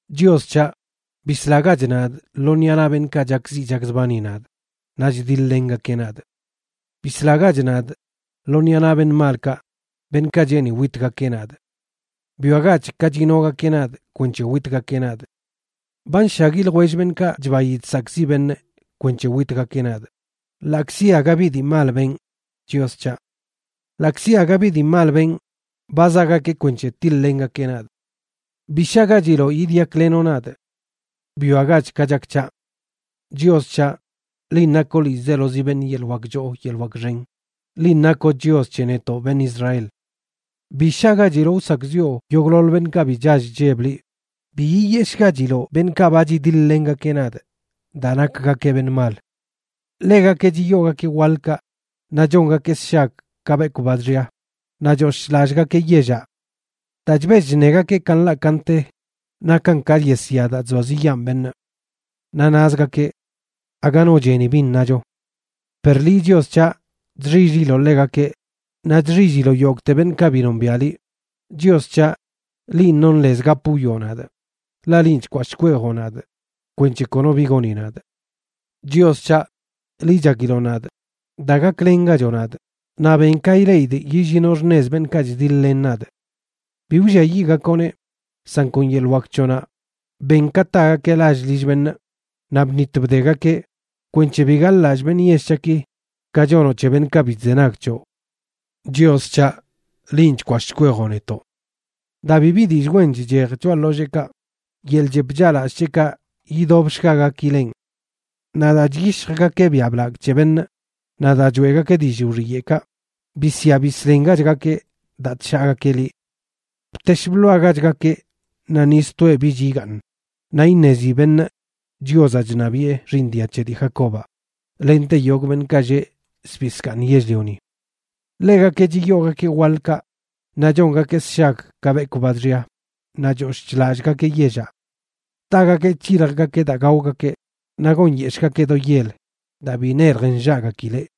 Chios c̱haꞌ, bislagach nadꞌ lo ṉiꞌa naꞌ beṉꞌkaꞌ chakziꞌ chakzbani nadꞌ, naꞌ chdiḻ-lengakeꞌ nadꞌ. Bislagach nadꞌ lo ṉiꞌa naꞌ beṉꞌ malkaꞌ, beṉꞌkaꞌ cheeni witgakeꞌ nadꞌ. Bwiagach ka chinogakeꞌ nadꞌ kwenc̱he witgakeꞌ nadꞌ. Ba nshagui ljwell beṉꞌkaꞌ chbayi chsakꞌziꞌ beṉꞌ kwenc̱he witgakeꞌ nadꞌ, ḻaꞌkzi aga bi dii mal benꞌ, Chios c̱haꞌ. Ḻaꞌkzi aga bi dii mal benꞌ, ba zaꞌgakeꞌ kwenc̱he tiḻ-lengakeꞌ nadꞌ. Bi shagachiloꞌ yidyaklenoꞌ nadꞌ. Bwiagach ka chak c̱haꞌ. Chios c̱haꞌ, linꞌ nakoꞌ ḻiizelozi beṉꞌ yeḻꞌ wak choo yeḻꞌ wak xen, linꞌ nakoꞌ Chios c̱he netoꞌ beṉꞌ Israel. Bi shagachiloꞌ wsakꞌziꞌo yogꞌḻoḻ beṉꞌkaꞌ bi chall chlleb liꞌ, bi yiyeshꞌgachiloꞌ beṉꞌkaꞌ ba chidiḻ-lengakeꞌ nadꞌ daa nakgakeꞌ beṉꞌ mal. Ḻegakeꞌ chiyoogakeꞌ waḻkaꞌ, naꞌ chongakeꞌ sshag ka bekwꞌ ba chxia, naꞌ choshꞌ chlallꞌgakeꞌ yellaꞌ. Daa chbell chṉegakeꞌ ka nḻaꞌ ka nte nakan ka yesya daa chzoaziꞌyaan beṉꞌ. Naꞌ nazgakeꞌ: “Aga no cheni bin nacho.” Per liꞌ, Chios c̱haꞌ, chxill-liloꞌ ḻegakeꞌ, naꞌ chxilliloꞌ yogꞌte beṉꞌkaꞌ bi nombiaꞌ liꞌ. Chios c̱haꞌ, linꞌ nonꞌ lez gap wwioꞌ nadꞌ, ḻaꞌ linꞌ chkwashꞌ chkweejoꞌ nadꞌ kwenc̱he kono bi goni nadꞌ. Chios c̱haꞌ, liꞌ chakiloꞌ nadꞌ. Da gaklengachoꞌ nadꞌ, naꞌ ben ka ileꞌidꞌ yillinoꞌ xṉez beṉꞌkaꞌ chdiḻ-len nadꞌ. Bi wlliayiꞌgakoꞌneꞌ, san kon yeḻꞌ wak c̱hoꞌnaꞌ ben ka tagakeꞌ lall lill beṉꞌ, naꞌ bṉit bdegakeꞌ, kwenc̱he bi gaḻꞌlallꞌ beṉꞌ yell c̱haꞌki ka chonoꞌ c̱he beṉꞌkaꞌ bi chzenag c̱hoꞌ. Chios c̱haꞌ, linꞌ chkwashꞌ chkweejoꞌ netoꞌ. Daa bibi dillꞌ wen chchej choꞌa ḻolleekaꞌ, yeḻꞌ chep chaꞌlallꞌ c̱heꞌkaꞌ yidobshgagakilenꞌ. Naꞌ daa chyishjgakeꞌ biaꞌ blagꞌ c̱he beṉꞌ naꞌ daa choeꞌgakeꞌ dillꞌ wxiyeꞌkaꞌ, bisya bisḻengachgakeꞌ daa chshaagakeꞌ liꞌ. ¡Btesh bḻoagachgakeꞌ naꞌ ni stoeꞌ bich igaaṉ! Naꞌ iṉezi beṉꞌ Chiozaꞌ chṉabiꞌe xiiṉ dia c̱he dii Jacobaꞌ lente yogꞌ beṉꞌ lleꞌ zbii zkaaṉ yell-lioni. Ḻegakeꞌ chiyoogakeꞌ waḻkaꞌ, naꞌ chongakeꞌ sshag ka bekwꞌ ba chxia, naꞌ choshꞌ chlallꞌgakeꞌ yellaꞌ. Tagakeꞌ c̱hiljgakeꞌ daa gaogakeꞌ, naꞌ gonyeshꞌgakeꞌ do yel daa bi nelj nllaꞌgakileꞌ.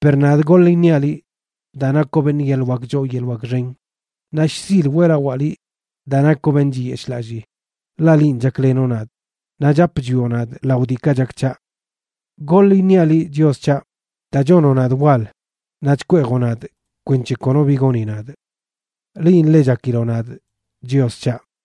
Per nadꞌ goḻ iṉiaꞌ liꞌ, daa nakoꞌ beṉꞌ yeḻꞌ wak choo yeḻꞌ wak xen, naꞌ shzil weꞌlawaa liꞌ daa nakoꞌ beṉꞌ chiyeshꞌlallii, ḻaꞌ linꞌ chaklenoꞌ nadꞌ, naꞌ chap chwioꞌ nadꞌ lao diikaꞌ chak c̱haꞌ. Goḻ iṉiaꞌ liꞌ, Chios c̱haꞌ, daa chonoꞌ nadꞌ wal naꞌ chkweejoꞌ nadꞌ kwenc̱he kono bi goni nadꞌ. Linꞌ ḻe chakiloꞌ nadꞌ, Chios c̱haꞌ.